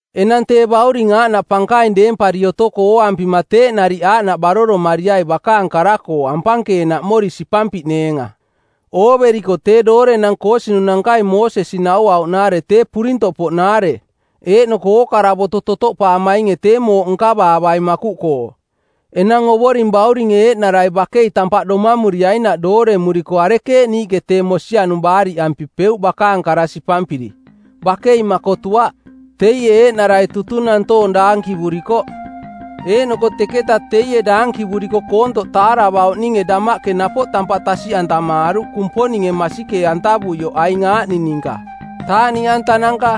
Enang tee Bauring aaꞌnaꞌ pankaing deempari otoko ooampima teeꞌ nariꞌ aaꞌnaꞌ baroromariai bakaang kara-koo ampankeenaꞌmori sipampiꞌneenga. Ooveriko tee doorenang koosinunankai Moosesi nauauꞌnaare tee purintoꞌpoꞌnaare eeꞌnoko ookara boto totoꞌpaamainge tee mooꞌ nkavaavaing makuꞌkoo. Enang Ovoring Bauringe eeꞌnarai bakei tampaꞌ domamuriainaꞌ dooremuriko arekeeꞌ niiꞌke tee mosianung baariꞌampipeuꞌ bakaang kara sipampiri? Bakei makotuaꞌ! Teie eeꞌnarai tutung nantoong daankivurikoꞌ; Eeꞌnoko teketa teie daankivuriko koontoꞌ taaravauꞌninge damaꞌke napoꞌ tampaꞌ tasiꞌantamaaruꞌ Kumponinge masikee-antavuioꞌ aing aaꞌning ninka: taaꞌniꞌantananka,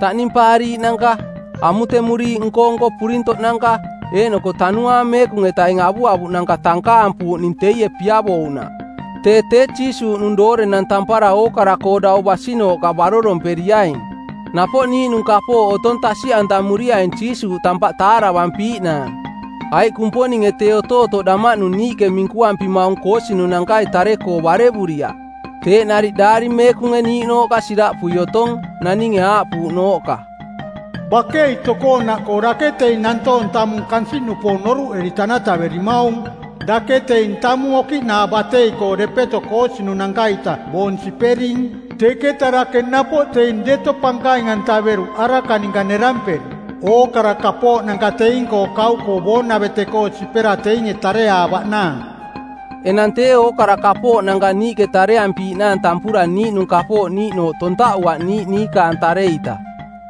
taꞌnimpaariiꞌnanka, amutemuriiꞌ nko-nko purintoꞌnanka, eeꞌnoko Tanuaang Meekung-etaing avuavuꞌnanka tankaampuuꞌning teie piavouꞌnaꞌ. Tee tee Jiisuuꞌnung doorenang tampara ookara-koo dau basinooꞌka baroromperiaing. Napoꞌ niiꞌnung kapooꞌ otong tasiꞌantamuriaing Jiisuuꞌ tampaꞌ taaravampiiꞌnaang, aiꞌ Kumponinge tee otootoꞌ damaꞌnung niiꞌke minkuampimaung koosinunankai tare-koo barevuriaꞌ. Teeꞌ nariꞌ Daari Meekunge niiꞌnooꞌka siraꞌpui otong, naninge aaꞌpuuꞌnooꞌka, “Bakei tokoonaꞌkoo dake teing nantoong tamung kansiꞌnupoong noruꞌeri tanataverimaung! Dake teing tamung okiꞌnaa batei-koo depeto koosinunanka-ita boong sipering, teketa dake napoꞌ teing deto pankaing-antaveruꞌ araka ninka neramperi, ookara kapooꞌnanka teing-koo kauꞌkoo boonavete-koo sipera teinge tareaavaꞌnaang.” Enang tee ookara kapooꞌnanka niiꞌke tareampiiꞌnaang tampura niiꞌnung kapooꞌ niiꞌnooꞌ tontaꞌuaꞌ niiꞌ niikaang tare-ita.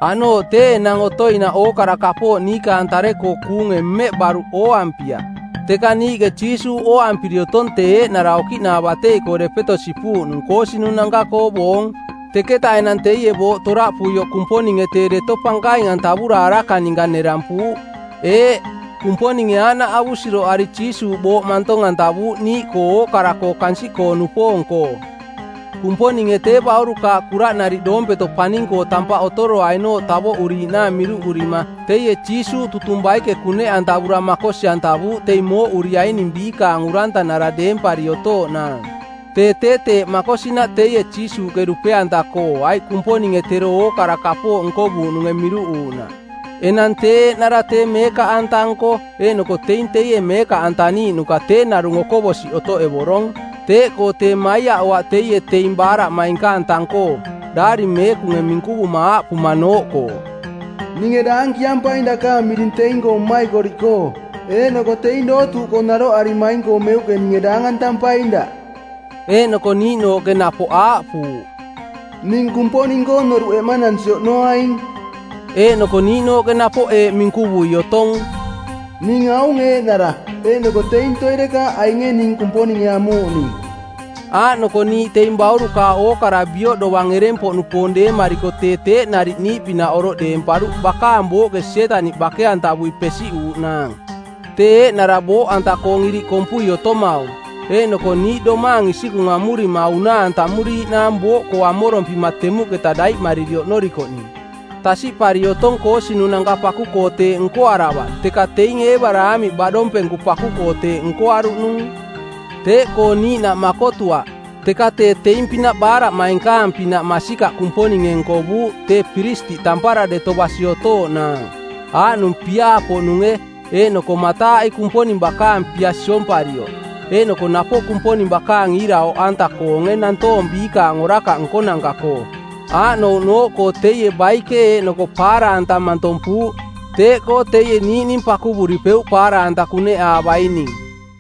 Aꞌnooꞌ tee enang otoinaꞌ ookara kapooꞌ niikaang tare-koo kuunge mmeꞌ baruꞌ ooampiaꞌ. Teka niiꞌke Jiisuuꞌ ooampiri otong tee eeꞌnara okiꞌnaa batei-koo depeto sipuuꞌnung koosinunanka-koo boong, teketa enang teie booꞌ toraꞌpuioꞌ Kumponinge tee deto pankaing-antavura araka ninka nerampuuꞌ. Eeꞌ, Kumponinge aaꞌnaꞌ avusiroꞌari Jiisuuꞌ booꞌ mantong-antavuuꞌ niiꞌkoo ookara-koo kansiꞌkoo-nupoong-koo. Kumponinge tee baurukaaꞌ kuraꞌnariꞌ doompeto paning-koo tampaꞌ otoroainooꞌ tavoꞌuriiꞌnaang miruꞌurima teie Jiisuuꞌ tutung baike kuneꞌantavura makosi-antavuuꞌ teing mooꞌuriaining biikaang urantanara deempari otooꞌnaang. Tee tee teeꞌ makosinaꞌ teie Jiisuuꞌke dupe-anta-koo aiꞌ Kumponinge tero ookara kapooꞌ nkovuuꞌnunge miruꞌuuꞌnaꞌ. Enang tee eeꞌnara tee meekaꞌanta-nko eeꞌnoko teing teie meekaꞌantaniiꞌnuka tee narung okoꞌbosiꞌ otoꞌevorong. Teeꞌkoo tee maiaꞌoaꞌ teie teing baaraꞌmainkaang tang-koo, daari meekunge minkuvuma aaꞌpumanooꞌkoo, “Ninge daankiampaing dakaang miring teing-koo mmaikoriꞌkoo, eeꞌnoko teing dootuuꞌkoo naroꞌarimaing-koo meuꞌke ninge daangantampaing daꞌ.” Eeꞌnoko niiꞌnooꞌke napoꞌ aaꞌpuuꞌ, “Ning Kumponing-koo noruꞌ eꞌmanansi oꞌnoaing.” Eeꞌnoko niiꞌnooꞌke napoꞌ eeꞌ minkuvui otong, “Ning aung eeꞌnara, eeꞌnoko teing toirekaaꞌ ainge ning Kumponinge amuuꞌning.” Aaꞌnoko niiꞌ teing baurukaaꞌ ookara bioꞌ dovang ereng-poꞌnupoong deemariko tee teeꞌ nariꞌ niiꞌpinaꞌ oroꞌ deemparuꞌ bakaang booꞌke Sietaniꞌ bake-antavui pesiꞌuuꞌnaang, tee eeꞌnara booꞌanta-koong iriꞌ kompui otomaung, eeꞌnoko niiꞌ domaang isikung amurima unaa-antamuriiꞌnaang booꞌkoo amorompima temuꞌketa daiꞌmariri oꞌnorikoꞌning. Tasiꞌpari otong koosinunanka paku-koo teeꞌ nkoaravaꞌ teka teing Eebaraamiꞌ baꞌdompenku paku-koo teeꞌ nkoaruꞌnung. Teeꞌkoo niiꞌnaꞌ makotuaꞌ, teka tee teing-pinaꞌ baaraꞌmainkaang-pinaꞌ masikaꞌ Kumponinge nkovuuꞌ tee piristiꞌ tampara deto basi otooꞌnaang. Aaꞌnung piaa-poꞌnunge eeꞌnoko mataaꞌi Kumponing bakaang pia siomparioꞌ, eeꞌnoko napoꞌ Kumponing bakaang iira oꞌanta-koonge nantoong biikaang orakaꞌ nkonanka-koo. Aaꞌnouꞌnooꞌkoo teie baike eeꞌnoko paara-anta mantompuuꞌ, teeꞌkoo teie niiꞌning pakuvuripeuꞌ paara-anta kuneꞌaavaining.